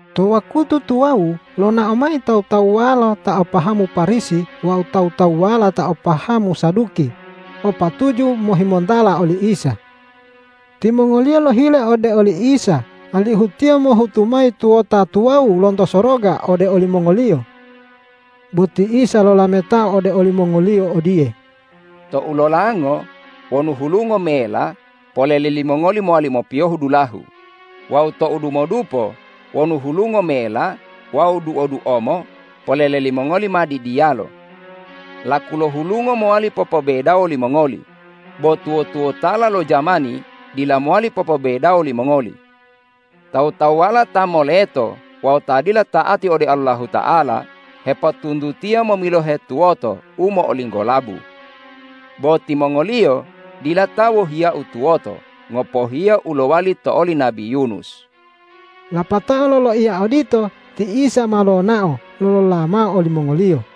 To wakutu tuwawu lonao mayi tawu-tawuwala ta o pahamu Parisi wawu tawu-tawuwala ta o pahamu Saduki o patuju mohimontala oli Isa. Timongoliyo lohile ode oli Isa alihu Tiyo mohutu mayi tuwota tuwawu lonto soroga ode olimongoliyo. Bo ti Isa lolametao ode olimongoliyo odiye,”Tou lolango wonu hulungo mela, polele limongoli mowali mopiyohu dulahu; wawu tou dumodupo wonu hulungo mela wawu duo-duomo, polele limongoli ma didiyalo. Laku lo hulungo mowali popobedawo limongoli, bo tuwo-tuwotala lo jamani dila mowali popobedawo limongoli. Tawu-tawuwala ta moleto wawu ta dila ta'ati ode Allahuta'ala, hepotuntutiya momilohe tuwoto u mo'olinggolabu. Bo timongoliyo dila ta wohiya-U tuwoto, ngopohiya u lowali to oli nabi Yunus.” Lapatao loloiya odito ti Isa ma lonao lolola mao olimongoliyo.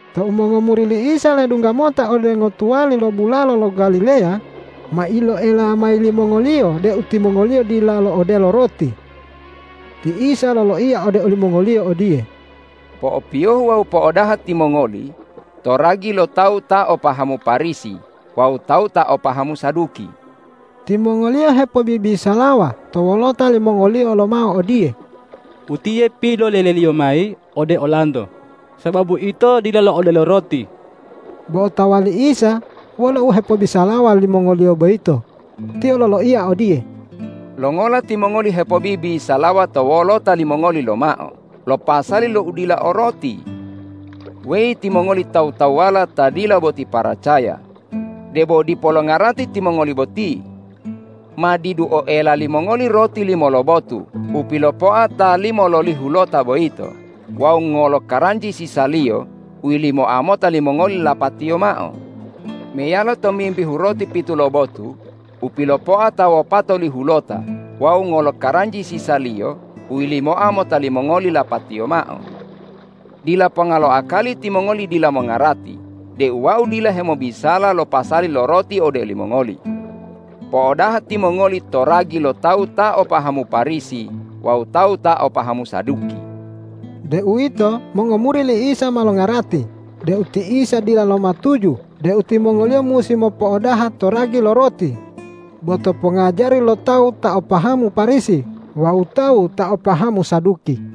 Tou mongomuri li Isa ledungga mota ode ngotuwali lo bulalo lo Galileya, ma iloela mayi limongoliyo deu timongoliyo dila lo'odelo roti. Ti Isa loloiya ode olimongoliyo odiye,”Po'opiyohu wawu po'odaha timongoli to ragi lo tawu ta o pahamu Parisi wawu tawu ta o pahamu Saduki.” Timongoliyo hepobibisalawa to wolota limongoliyo lomao odiye,”Utiye pilolele-Liyo mayi ode olanto sababu ito dila lo'odelo roti.” Bo otawa li Isa wolo u hepobisalawa limongoliyo boyito. Tiyo loloiya odiye,”Longola timongoli hepobibisalawa to wolota limongoli lomao lo pasali lo udila o roti? Weyi timongoli tawu-tawuwala ta dila boti paracaya. Debo dipo longarati timongoli boti? Ma didu oela limongoli roti limo lobotu u pilopoa ta limololihulota boyito wawu ngolo karanji sisaliyo u yilimoa mota limongoli lapatiyo mao? Meyalo tomimbihu roti pitu lobotu u pilopoa ta wopatolihulota wawu ngolo karanji sisaliyo u yilimoa mota limongoli lapatiyo mao? Dila ponga lo akali timongoli dila mongarati deu Wau dila hemobisala lo pasali lo roti ode olimongoli. Po'odaha timongoli to ragi lo tawu ta o pahamu Parisi wawu tawu ta o pahamu Saduki.” Deuwito mongomuri li Isa ma longarati deu ti Isa dila lomatuju deu timongoliyo musi mopo'odaha to ragi lo roti, bo to pongajari lo tawu ta o pahamu Parisi wawu tawu ta o pahamu Saduki.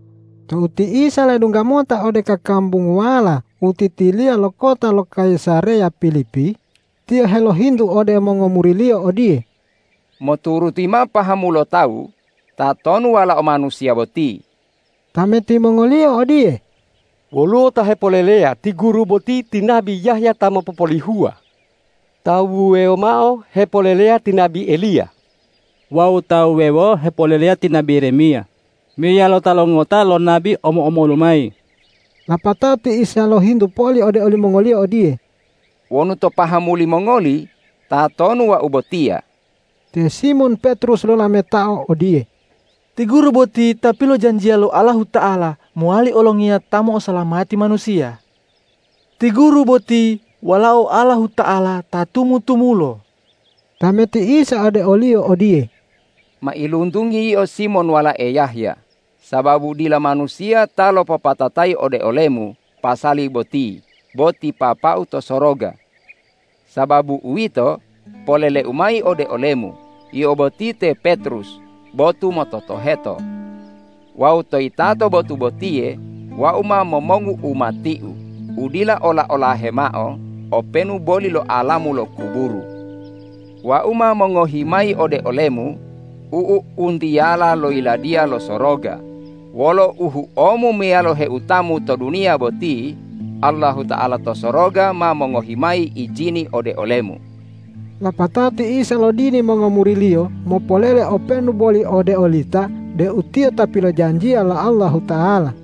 Tou ti Isa ledungga mota ode kakambunguwala u titiliya lo kota lo Kayisareya Pilipi, Tiyo helohintu ode mongomuri-Liyo odiye,”Moturuti mao pahamu lo tawu, tatonu Walao Manusiya boti?” Tameti mongoliyo odiye,”Woluwo ta hepoleleya ti Guru boti ti nabi Yahya ta mopopolihuwa. Tawu wuwewo mao hepoleleya ti nabi Eliya. Wawu tawu wuwewo hepoleleya ti nabi Yeremiya meyalo tala ngota lo nabi omo-omolu mayi.” Lapatao ti Isa lohintu poli ode olimongoliyo odiye,”Wonu to pahamu limongoli, tatonu Wau botiya?” Te Simon Petrus lolametao odiye,”Ti Guru boti Ta pilojanjiya lo Allahuta'ala mowali olongiya ta mo'osalamati manusiya! Ti Guru boti Walao Allahuta'ala ta tumu-tumulo!” Tameti Isa ode oliyo odiye,”Mailuntungi yio Simon walae Yahya, sababu dila manusiya ta lopopatatayi ode olemu pasali boti bo ti Papa-U to soroga. Sababu uwito, polele-U mayi ode olemu: Yio boti te Petrus, botu mototoheto. Wawu to yitato botu botiye Wau ma momongu umati-U u dila ola-olahe mao openu boli lo alamu lo kuburu. Wau ma mongohi mayi ode olemu u'u-u'untiyala lo Yiladiya lo Soroga. Wolo u huomu meyalo heutamu to duniya boti, Allahuta'ala to soroga ma mongohi mayi ijini ode olemu.” Lapatao ti Isa lodini mongomuri-Liyo mopolele openu boli ode olita deu Tiyo ta pilojanjiya lo Allahuta'ala.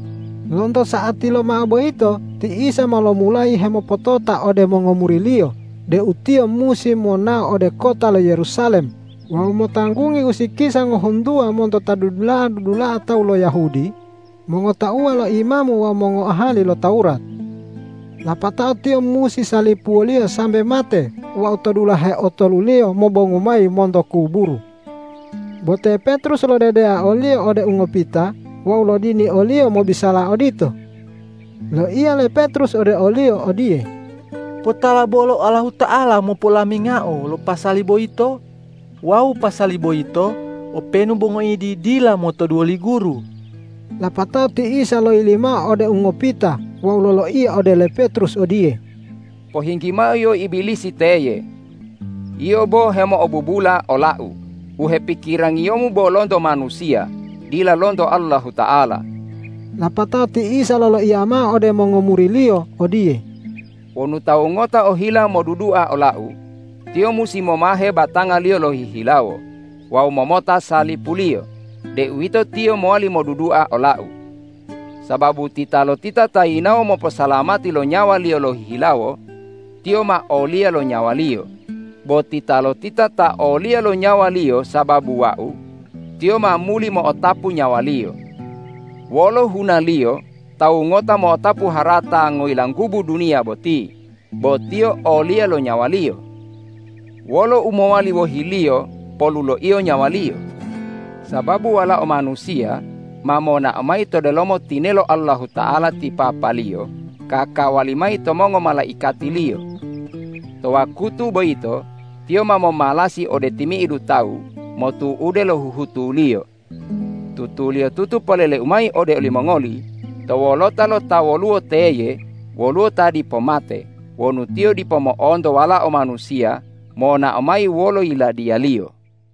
Lonto sa'ati lomao boyito ti Isa ma lomulayi hemopotota ode mongomuri-Liyo deu Tiyo musi monao ode kota lo Yerusalem wawu motanggungi usikisa ngohuntuwa monto ta dudula'a-dudula'a tawu lo Yahudi, mongotauwa lo imamu wawu mongoahali lo Tawurat. Lapatao Tiyo musi salipuwoliyo sambe mate wawu to dulahe otoluliyo mobongu mayi monto kuburu. Bo te Petrus lodedeao o-Liyo ode ungopita wawu lodini o-Liyo mobisala odito. Loiya le Petrus ode o-Liyo odiye,”Potala bolo Allahuta'ala mopo'olamingao lo pasali boyito wawu pasali boyito openu bo ngoidi dila motoduwo li Guru.” Lapatao ti Isa loyili mao ode ungopita wawu loloiya ode le Petrus odiye,”Pohinggi mao yio Ibilisi teye. Yio bo hemo'obubula ola-U, u hepikirangiyomu bo lonto manusiya dila lonto Allahuta'ala.” Lapatao ti Isa loloiya mao ode mongomuri-Liyo odiye,”Wonu tawu ngota ohila modudua ola-U, tiyo musi momahe batangaliyo lohihilawo wawu momota salipuliyo, deuwito tiyo mowali modudua ola-U. Sababu titalotita ta yinawo moposalamati lo nyawaliyo lohihilawo, tiyo ma oliya lo nyawaliyo; bo titalotita ta oliya lo nyawaliyo sababu Wau, tiyo ma muli mo'otapu nyawaliyo. Wolo hunaliyo tawu ngota mo'otapu harata ngoyilanggubu duniya boti bo tiyo oliya lo nyawaliyo? Wolo u mowali wohiliyo poluloiyo nyawaliyo? Sababu Walao Manusiya ma monao mayi to delomo tinelo Allahuta'ala ti Papa-Liyo kakawali mayi to mongomalaikati-Liyo. To wakutu boyito Tiyo ma momalasi ode timi'idu tawu motu'ude lo huhutuliyo. Tutuliyotutu polele-U mayi ode olimongoli: To wolota lo ta woluwo teye woluwo ta dipo mate wonu tiyo dipo mo'onto Walao Manusiya monao mayi wolo Yiladiya-Liyo.”